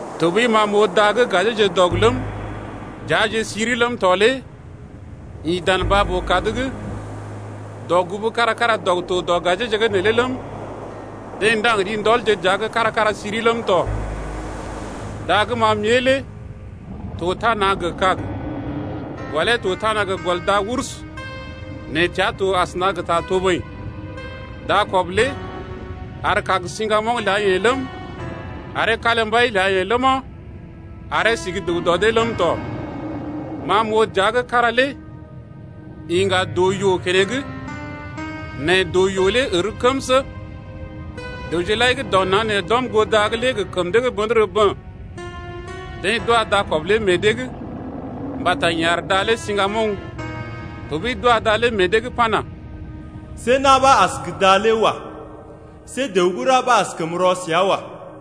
Tɔɓəi ma m’oo da gə́ gajeeje dɔg ləm, dəaje siri ləm tɔ lé ḭ dan baa-boo-kad’g. Dɔgugu kára-kára dɔg to dɔ gajeeje’g neelé ləm, deḛ ndaŋg ri ndɔl dəaje’g kára-kára siri ləm tɔ. Da gə́ ma m’ée lé to tana gə kàg. Gɔlee to tana gə gɔl da-urs nɛ təa to asəna gə ta toboḭ. Dakɔb lé ar kàg siŋgamoŋ ləa-yeḛ ləm, aree kalimbai ləa-yeḛ ləma, aree si gə́ dəw dɔ dee ləm tɔ. Ma m’oo dəa gə́ kára lé iŋga doo-yoo keneŋ nɛ doo-yoo lé ər kəmsə. Dəwje lai gə́ dɔ naŋg nee d’ɔm goo da’g lé gə kəm dee gə́ bə̰dərə bə̰. Deḛ d’wa dakɔb lé meḛ dee’g mbata yeḛ ar da lé siŋgamoŋ, tɔɓəi d’wa da lé meḛ dee’g pana: See na̰ ɓa as gə da lé wa. See dəw gə́ ra ɓa askəm rɔ səa wa.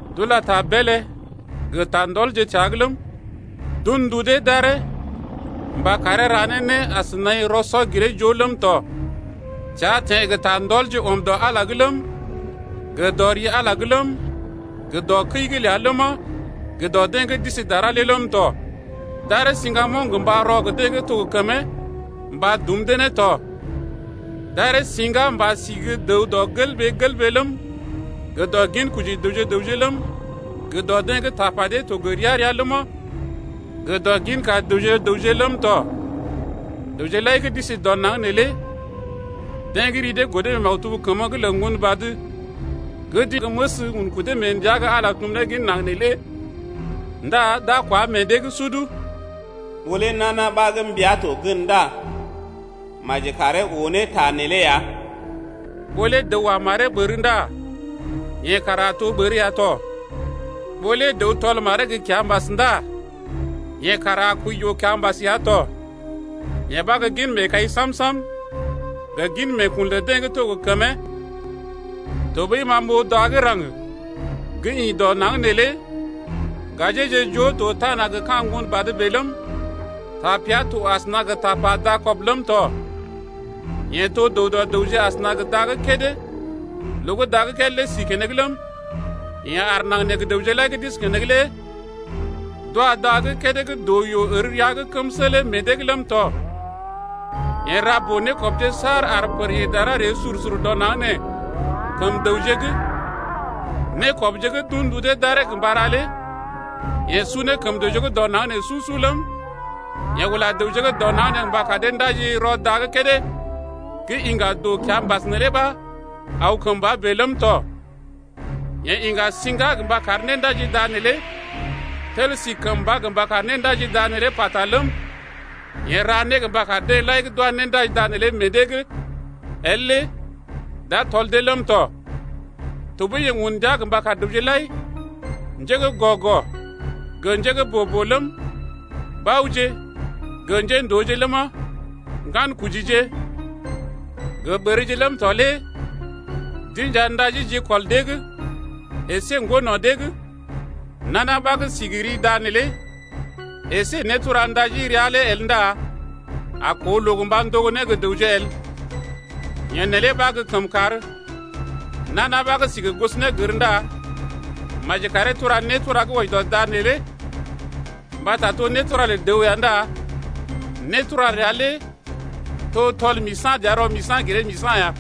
D’ula ta beelé gə ta ndɔlje təa’g ləm, d’un ndu dee d’aree mba karee ra ne né as naḭ rɔ-sɔ-giree-joo ləm tɔ. Tea teḛ gə ta ndɔlje ɔm dɔ Ala’g ləm, gə dɔ ri Ala’g ləm, gə dɔ kəi’g ləa ləma, gə dɔ deḛ gə́ d’isi dara lé ləm tɔ. D’aree siŋga mba rɔ gə deḛ gə́ to gə kəmee mba dum dee ne tɔ. D’aree siŋga mba sí gə́ dəw dɔ gelɓee-gelɓee ləm, gə dɔ ginkoji dəwje gə raŋg ləm, gə dɔ deḛ gə́ tapa dee to gə ria-ria ləma, gə dɔ ginka dəwje-dəwje ləm tɔ. Dəwje lai gə́ d’isi dɔ naŋg nee lé deḛ gə́ ri dee godo mee maktub kəmə’g lə Ŋgonbad gə́ d’inja gə́ məs un kudee mee ndəa gə́ Ala tum ne gin naŋg nee lé ndá d’a kwá meḛ dee’g sud. Ɓó lé nana ɓa gə́ mbia to gən ndá maji karee oo ne ta nee lé ya Ɓó lé dəw wa maree ɓər ndá yeḛ kara a to ɓər ya tɔ, ɓó lé dəw tɔl maree gə kiambas ndá yeḛ kara a kəi yoo-kiambas ya tɔ. Yee ɓa gə́ gin meekai sam-sam gə gin meekun lə deḛ gə́ to gə kəmee. Tɔɓəi ma m’oo da gə́ raŋg gə́ ḭ dɔ naŋg neelé, gajeeje joo to tana gə ka̰ ŋgon badə bèe ləm, tapea to asəna gə tapa dakɔb bèe ləm tɔ. Yeḛ to dəw dɔ dəwje asəna gə da gə́ kédé loo gə́ da gə́ kédé lé si keneŋ ləm, yeḛ ar naŋg nee gə dəwje lai gə́ d’isi keneŋ lé d’wa da gə́ kédé gə́ doo-yoo ər rəa’g kəmsə lé meḛ dee’g ləm tɔ. Yeḛ ra boo-nékɔbje saar ar pər ḭ dara ree sur-sur dɔ naŋg nee kəm dəwje’g. Nékɔbje gə́ d’un ndu dee d’aree mba ra lé yeḛ su ne kəm dəwje gə́ dɔ naŋg nee su-su ləm, yeḛ ula dəwje gə́ dɔ naŋg nee mba kar dee ndaji rɔ da gə́ kédé gə́ iŋga doo-kiambas neelé ɓa aw kəmba bèe ləm tɔ. Yeḛ iŋga siŋga gə mba kar néndaji da neelé tel si kəmba mba kar néndaji da neelé pata ləm, yeḛ ra né mba kar deḛ lai gə́ d’wa néndaji da neelé meḛ dee’g el lé d’a tɔl dee ləm tɔ. Tɔɓəi yeḛ un ndia mba kar dəwje lai, njé gə́ gɔ-gɔ gə njé gə́ boo-boo ləm, baoje gə njéndooje ləma, ŋgankojije gə ɓərje ləm tɔ lé d’inja ndaji jikɔl dee’g əsé ŋgo no̰ dee’g. Nana ɓa gə́ si gə ri da neelé əsé nétura néndaji ria lé el ndá a koo loo mba ndogo né gə dəwje el. Yee neelé ɓa gə́ kəmkàr. Nana ɓa gə́ si gə gosonégər ndá maji karee tura nétura gə́ wɔji dɔ da lé. Mbata to nétura lə dəw ya ndá nétura ləa lé to tɔl-misa̰-dəa-rɔ-misa̰-giree-misa̰ ya.